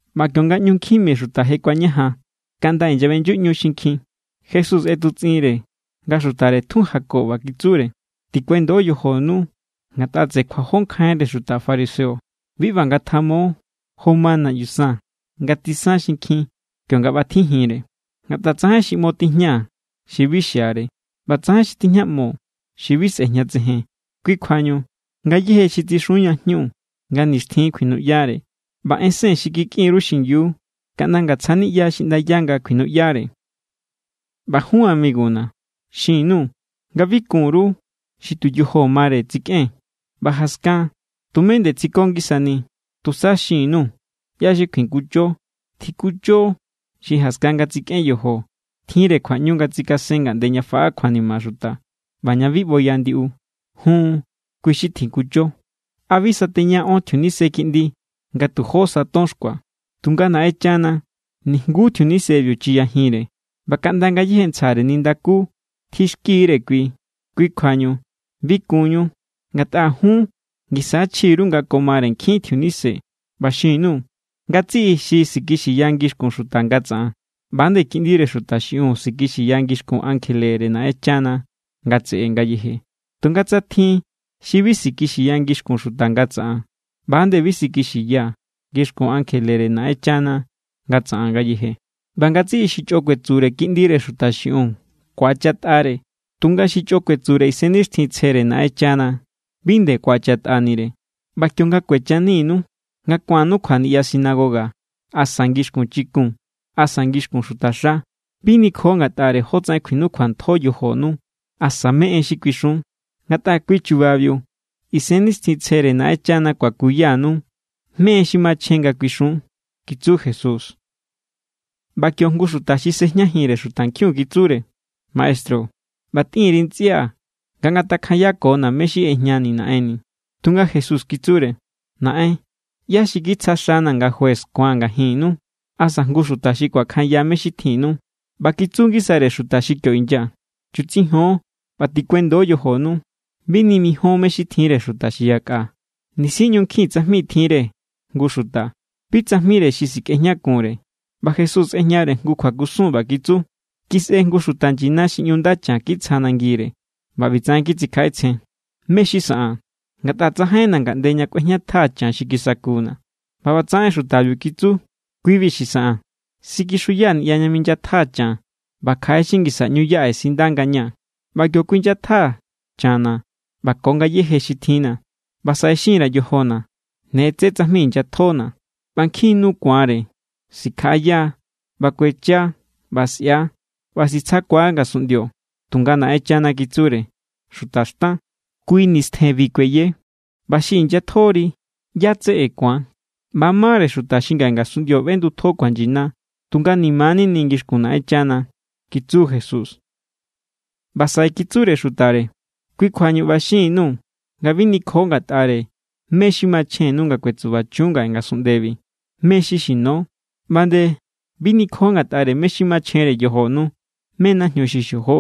ꞌBa kionga ꞌñu nkjin mi xuta je kuañajan kaꞌnda inyaꞌbeꞌnyuꞌñu xinkjin, Jesús ꞌetutsꞌinre nga xutare tjun jako, ꞌba kitsure: —Tikuendo yojonu ngatꞌa tseꞌe kjuajó nkjainre xuta fariseo. Bi ꞌba ngatjamo jo ma naꞌyu san nga tsisan xinkjin kionga ꞌbatjijinre. Ngatꞌa tsajain xi ꞌmo tijña xi bi xiare, ꞌba tsajain xi tijñaꞌmo xi bi sꞌejñatsejen. Kui kjuañu, ngayéje xi tsixun ña jñu, nga nixtjin kjuinuꞌyare. ꞌBa ensen xi kikꞌin_ru xingiu, kaꞌnda ngatsja niꞌya xiꞌndaya nga kjuinuꞌyare. ’ꞌBa jun amiguna̱, xin_nuu̱ nga bi kun_ru xi tu yojo mare tsikꞌen, ꞌba jaskan tumé nde tsiko ngisani. Tusa xin_nuu̱ ꞌyá= xi kjuikuncho. Tjikuncho xi jaskan nga tsikꞌen yojo, tjinre kjuaꞌñu nga tsikasen ngaꞌnde ña faꞌa kjuanima xuta ꞌba ña bi ꞌboya ndiꞌu. Jun, kui= xi tjikuncho. ’¿A bi sateña ón tjiunise kiꞌndi nga tu jó sa ton xkua? Tunga Naꞌenchana nijnguú tjiunisebiu chiyajinre. ꞌBa kaꞌnda ngayéje ntsjare nindakú tjixkire kui. Kui kjuañu bi kunñu, ngatꞌa jun ngisa= chji_ru nga ko mare nkjin tjiunise. ’ꞌBa xin_nuu̱, ngatsiꞌi xi sikixiya ngixkun xuta nga tsaꞌan, ꞌba=nde Kiꞌndire Xuta xiꞌiun sikixiya ngixkun ankjelere Naꞌenchana nga tseꞌe ngayeje. Tunga tsa tjin xi bi sikixiya ngixkun xuta nga tsaꞌan, ꞌba=nde bi sikixiyaa̱ ngixkun ankjelere Naꞌenchana nga tsaꞌan ngayeje. ’ꞌBa ngatsiꞌi xi chꞌo kuetsure Kiꞌndire Xuta xiꞌiun, ku̱achatꞌare. Tunga xi chꞌo kuetsure Isennixtjintsjere Naꞌenchana, bi nde ku̱achatꞌanire. ’ꞌBa kionga kuechaninu nga ku̱annu kjua niꞌya sinagoga asa ngixkun chikun asa ngixkun xutaxa, bi nikjo ngatꞌare jótsaꞌen kjuinukjuantjo yojonu asa mé= en xi kuixun. Ngatꞌa kui chubabiu Isennixtjintsjere Naꞌenchana kuakuyanu mé= en xi machjen nga kuixun —kitsu Jesús. ꞌBa kio jngu xuta xi sejñajinre xutankjiun kitsure: —Maestru, ꞌba tꞌin_ri ntsꞌia̱ nga ngatakjanyakona̱ mé= xi ꞌejña naꞌenni̱. Tunga Jesús kitsure: —Naꞌen, ¿ꞌyá= xi kitsja xana̱ nga juez ku̱an ngajinnu, asa jngu xuta xi kuakjanya mé= xi tjinnu? ꞌBa kitsu ngisare xuta xi kio inya: —Chutsijon ꞌba tikuendo yojonu. Bi nimijion mé= xi tjinre xuta xi yakꞌa. Nisi ꞌñu nkjin tsajmi tjinre jngu xuta, bi tsajmire xi sikꞌejñakunre. ꞌBa Jesús ꞌejñare jngu kjuakusun, ꞌba kitsu: —Kisꞌe jngu xuta nyina xi ꞌñu nda chan kitsja nangire. ꞌBa ꞌbitsaꞌen kitsikjaꞌetsjen: “¿Mé= xi saꞌaa̱n? Ngatꞌa tsajainna̱ ngaꞌnde ña kꞌuejñatjaa̱ chan xi kisakuna̱.” ꞌBa ꞌbatsaꞌen xutabiu kitsu: “Kui=bi xi saꞌaa̱n. Sikixuyaa̱ niꞌya ña minyatjaa̱ chan, ꞌba kjaꞌe xi ngisa= ꞌñu yaꞌe sinda ngañaa̱. ꞌBa kio kuinyatjaa̱ channa̱ ꞌba ko ngayéje xi tjinna̱. ꞌBa saꞌe xin_ra̱ yojona̱: Ne tsé tsajmi inyatjona̱, ꞌba nkjin= nu ku̱anre. Sikjaꞌaya ꞌba kuechia ꞌba sꞌia ꞌba sitsjakua ngasunꞌndio.” Tunga Naꞌenchana kitsure: “Xuta xtan, kui nistjenbi kueye. ꞌBa xi inyatjori, ¿ꞌyá= tseꞌe ku̱an?” ꞌBa= mare xuta xi ngaꞌe ngasunꞌndio ꞌbendutjo kjuanyina, tunga ni̱ma̱= nini ngixkun Naꞌenchana —kitsu Jesús. ꞌBa saꞌe kitsure xutare: —Kui kjuañu ꞌba xin_nuu̱ nga bi nikjo ngatꞌare mé= xi machjennu nga kuetsubachun ngaꞌe ngasunꞌndebi, mé= xi xino. ꞌBa nde bi nikjo ngatꞌare mé= xi machjenre yojonu, mé= najñu xi xojo.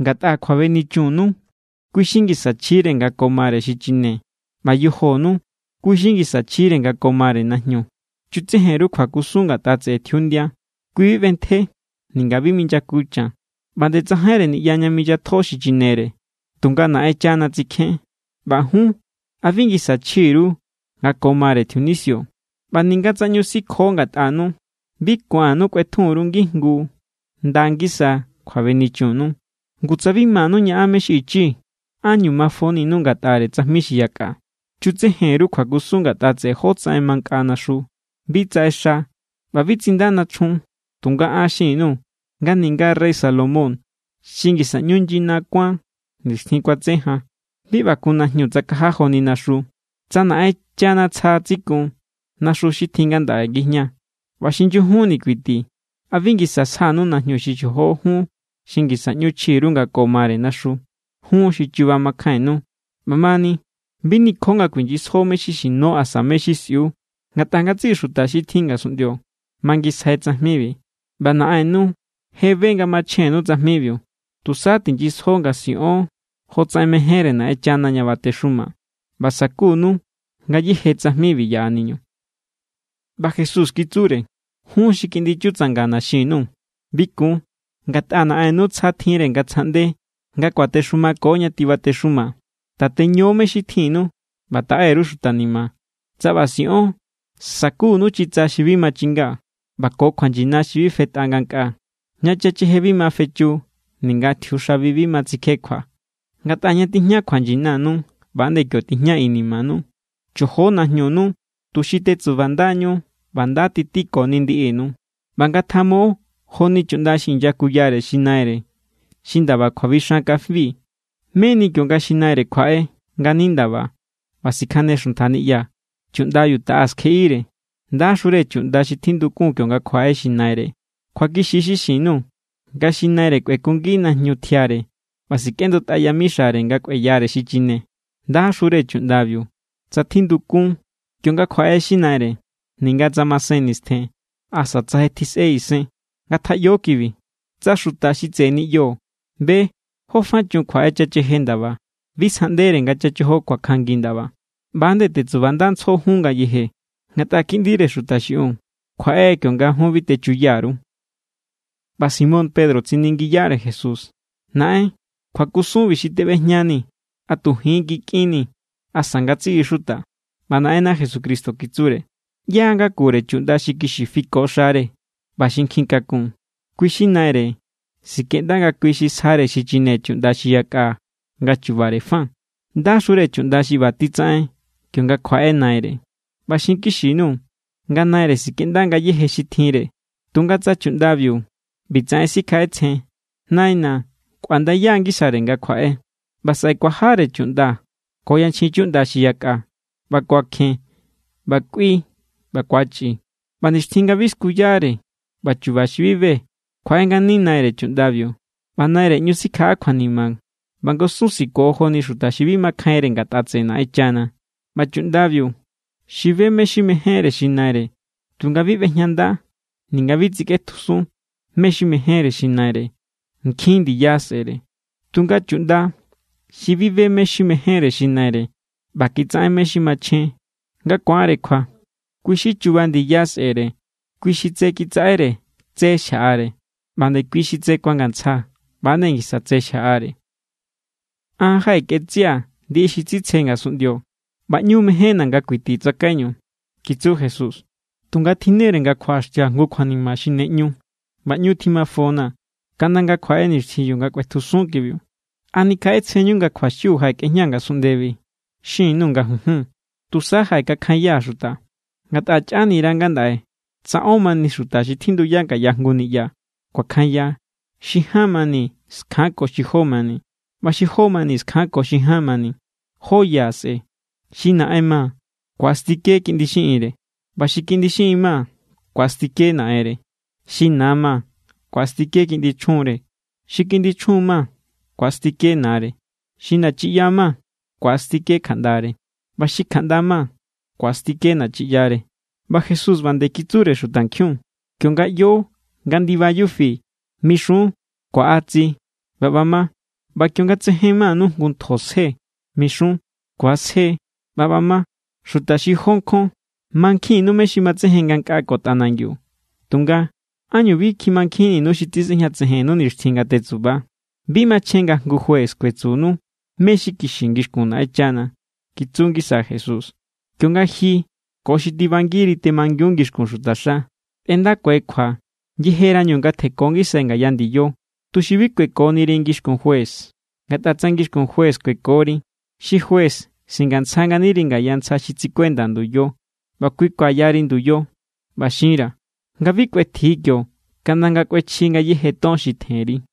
Ngatꞌa kjuabenichunnu, kui= xi ngisa chjire nga ko mare xichine. ꞌBa yojonu, kui= xi ngisa chjire nga ko mare najñu. Chutsejen_ru kjuakusun ngatꞌa tseꞌe tjiundia. Kui bi ꞌbentje, ninga bi minyaku chan, ꞌba nde tsajainre niꞌya ña minyatjo xichinere. Tunga Naꞌenchana tsikjén. ꞌBa jun, ¿a bi ngisa chji_ru nga ko mare tjiunisio? ꞌBa ninga tsa ꞌñu sikjo ngatꞌanu, bi ku̱annu kꞌuetjun_ru ngijngu nda ngisa kjuabenichunnu. Ngu tsa bi manu ñaꞌan mé= xi ichi, ¿ánñu mafoninu ngatꞌare tsajmi xi yakꞌa? ’Chutsejen_ru kjuakusun ngatꞌa tseꞌe jotsaꞌen mankꞌa naxu. Bi tsaꞌexa ꞌba bi tsinda nachjun. Tunga an xin_nuu̱ nga ninga rey Salomón xi ngisa ꞌñu nyina kuán nixtjin kuatse jan, bi ꞌba kun najñu tsakaja joni naxu. Tsa Naꞌenchana tsja tsikun naxu xi tjin ngandaꞌe ngijña ꞌba xi nyujunni kuiti, ¿a bi ngisa sjanu najñu xi xojo jun xi ngisa ꞌñu chji_ru nga ko mare naxu? ¡Jun xi chuba makjainnu! ꞌBa mani, bi nikjo nga kuinyisjo mé= xi xino asa mé= xi sꞌiu. Ngatꞌa ngatsiꞌi xuta xi tjin ngasunꞌndio mangisjai tsajmibi, ꞌba Naꞌennu je be nga machjennu tsajmibiu. Tusa tinyisjo nga siꞌon jotsaꞌen mejénre Naꞌenchana ña batexuma, ꞌba sakunu ngayéje tsajmibi yaꞌaniñu. ꞌBa Jesús kitsure: —Jun xi kiꞌndi chutsangana̱ xin_nuu̱, bi kun. Ngatꞌa Naꞌennu tsja tjinre nga tsjaꞌnde nga kuatexumako ña tibatexuma. Tateño mé= xi tjinnu ꞌba taꞌe_ru xuta ni̱ma̱. Tsa ꞌba siꞌon, sakunu chitsa xi bi machinga, ꞌba ko kjuanyina xi bi fetꞌa ngankꞌaa, ña chacheje bi ma fechu ninga tjiuxabi bi ma tsikjekjua. Ngatꞌa ña tijña kjuanyinanu, ꞌba=nde kio tijña inimanu. ’Chojo najñunu tuxi tetsubandañu ꞌba nda titikoni ndiꞌinu. ꞌBa ngatjamo joni chuꞌnda xi inyakuyare xi naire xi ndaba kjuabixan kafi, meni kionga xi naire kjuaꞌe ngani ndaba ꞌba sikjane xuntja niꞌya, chuꞌndabiu taꞌa skjeꞌire. Ndaxure chuꞌnda xi tjindukun kionga kjuaꞌe xi naire. Kjuakixi= xi xin_nuu̱ nga xi naire kꞌuekungi najñu tjiare ꞌba sikꞌendutꞌa yamixare nga kꞌueyare xichine. Ndaxure chuꞌndabiu, tsa tjindukun kionga kjuaꞌe xi naire, ninga tsa masen nistjen asa tsa je tjisꞌe isen. Ngatjaꞌyo kibi: Tsa xuta xi tseꞌe niꞌyo be jó fa chun kjuaꞌe chacheje ndaba, bi sjaꞌndere nga chachojo kuakjanngi ndaba. ꞌBa=nde tetsubandantsjo jun ngayeje, ngatꞌa Kiꞌndire Xuta xiꞌiun kjuaꞌe kionga jun bi techuya_ru. ꞌBa Simón Pedro tsiningiyare Jesús: —Naꞌen, kjuakusunbi xi teꞌbejñanii̱, ¿a tu ji̱n= kikꞌinnii̱, asa ngatsiꞌi xuta? ꞌBa Naꞌenna Jesucristo kitsure: —¿ꞌYá= ngakure chuꞌnda xi kixi fiko xare ꞌba xi nkjin kakun, kui= xi naire sikꞌenda nga kui xi sjare xichine chuꞌnda xi yakꞌa nga chubare fa? ¡Ndaxure chuꞌnda xi ꞌba titsaꞌen kionga kjuaꞌe naire! ꞌBa xinkixi_nuu̱ nga naire sikꞌenda ngayéje xi tjinre. Tunga tsa chuꞌndabiu ꞌbitsaꞌen sikjaꞌetsjen: “Naina̱ kꞌuandaya=ngisare nga kjuaꞌe”, ꞌba saꞌe kuajare chuꞌnda ko yanchjin chuꞌnda xi yakꞌa, ꞌba kuakjen ꞌba kꞌui ꞌba ku̱achꞌi; ꞌba nixtjin nga bi skuyare ꞌba chu̱ba̱ xi bi be, kjuaꞌe ngani naire chuꞌndabiu. ꞌBa naire ꞌñu sikjaꞌa kjuanima ꞌba ngusun siko joni xuta xi bi makjainre ngatꞌa tseꞌe Naꞌenchana. ’ꞌBa chuꞌndabiu xi be mé= xi mejénre xi naire tunga bi ꞌbejñanda ninga bi tsikꞌetjusun mé= xi mejénre xi naire, nkjin ndiya sꞌe̱re. Tunga chuꞌnda xi bi be mé= xi mejénre xi naire ꞌba kitsaꞌen mé= xi machjen nga ku̱anre kjua, kui= xi chuba ndiya sꞌe̱re. Kui xi tse kitsaꞌere, tse xjaꞌare; ꞌba nde kui xi tse kuangantsja, ꞌba=nde ngisa tse xjaꞌare. ’An jaꞌekꞌetsꞌia̱ ndiꞌi xi tsitsje ngasunꞌndio ꞌba ꞌñu mejénna̱ nga kuiti tsakaiñu —kitsu Jesús—. Tunga tjinnere nga kjuaꞌaxtia̱ jngu kjuanima xi ne ꞌñu, ꞌba ꞌñu tjimafona̱ kaꞌnda nga kjuaꞌe nixtjin nga kꞌuetjusun kibiu. ¿A nikjaꞌetsjenñu nga kjuaxiu jaꞌekꞌejñaa̱ ngasunꞌndebi? Xin_nuu̱ nga junjun, tusa jaꞌekakjanyaa̱ xuta. Ngatꞌa chꞌanira ngandaꞌe tsa ón mani xuta xi tjinduya ngaya jngu niꞌya, kuakjanya: xi ján mani skjanko xi jó mani, ꞌba xi jó mani skjanko xi ján mani. Jó ya sꞌe̱. Xi naꞌen ma ku̱astike kiꞌndi xiꞌinre; ꞌba xi kiꞌndi xiꞌin ma ku̱astike naꞌenre; xi na ma ku̱astike kiꞌndi chjunre; xi kiꞌndi chjun ma ku̱astike nare; xi nachiꞌya ma ku̱astike kjaꞌndare; ꞌba xi kjaꞌnda ma ku̱astike nachiꞌyare. ꞌBa Jesús ꞌba nde kitsure xutankjiun: —Kionga ꞌyo nga ndiba yufi, mixun: “Kuaꞌa tsi”, ꞌba ꞌba ma. ꞌBa kionga tsejen manu jngu ntjo sje, mixun: “Ku̱asje”, ꞌba ꞌba ma. ¡Xuta xi jó nkjon! Mankjinnu mé= xi matsejen ngankꞌaa ko tꞌanangiu. Tunga, ¿ánñu bi kjimankjinninu xi tisꞌejñatsejen nixtjin nga tetsuba? ’Bi machjen nga jngu juez kuetsunu mé= xi kixi ngixkun Naꞌenchana —kitsu ngisa Jesús—. Kionga ji ko xi tibangiri temangiu ngixkun xutaxa, tꞌendakue kjua yejerañu nga tjenko ngisai ngaya ndiyo, tuxi bi kuekoniri ngixkun juez. Ngatꞌa tsa ngixkun juez kuekori, xi juez singantsja nganiri ngaya ntsja xi tsikuenda nduyo ꞌba kui kuayari nduyo. ꞌBa xinra̱ nga bi kꞌuetji kio kaꞌnda nga kꞌuechji ngayéje ton xi tjenri.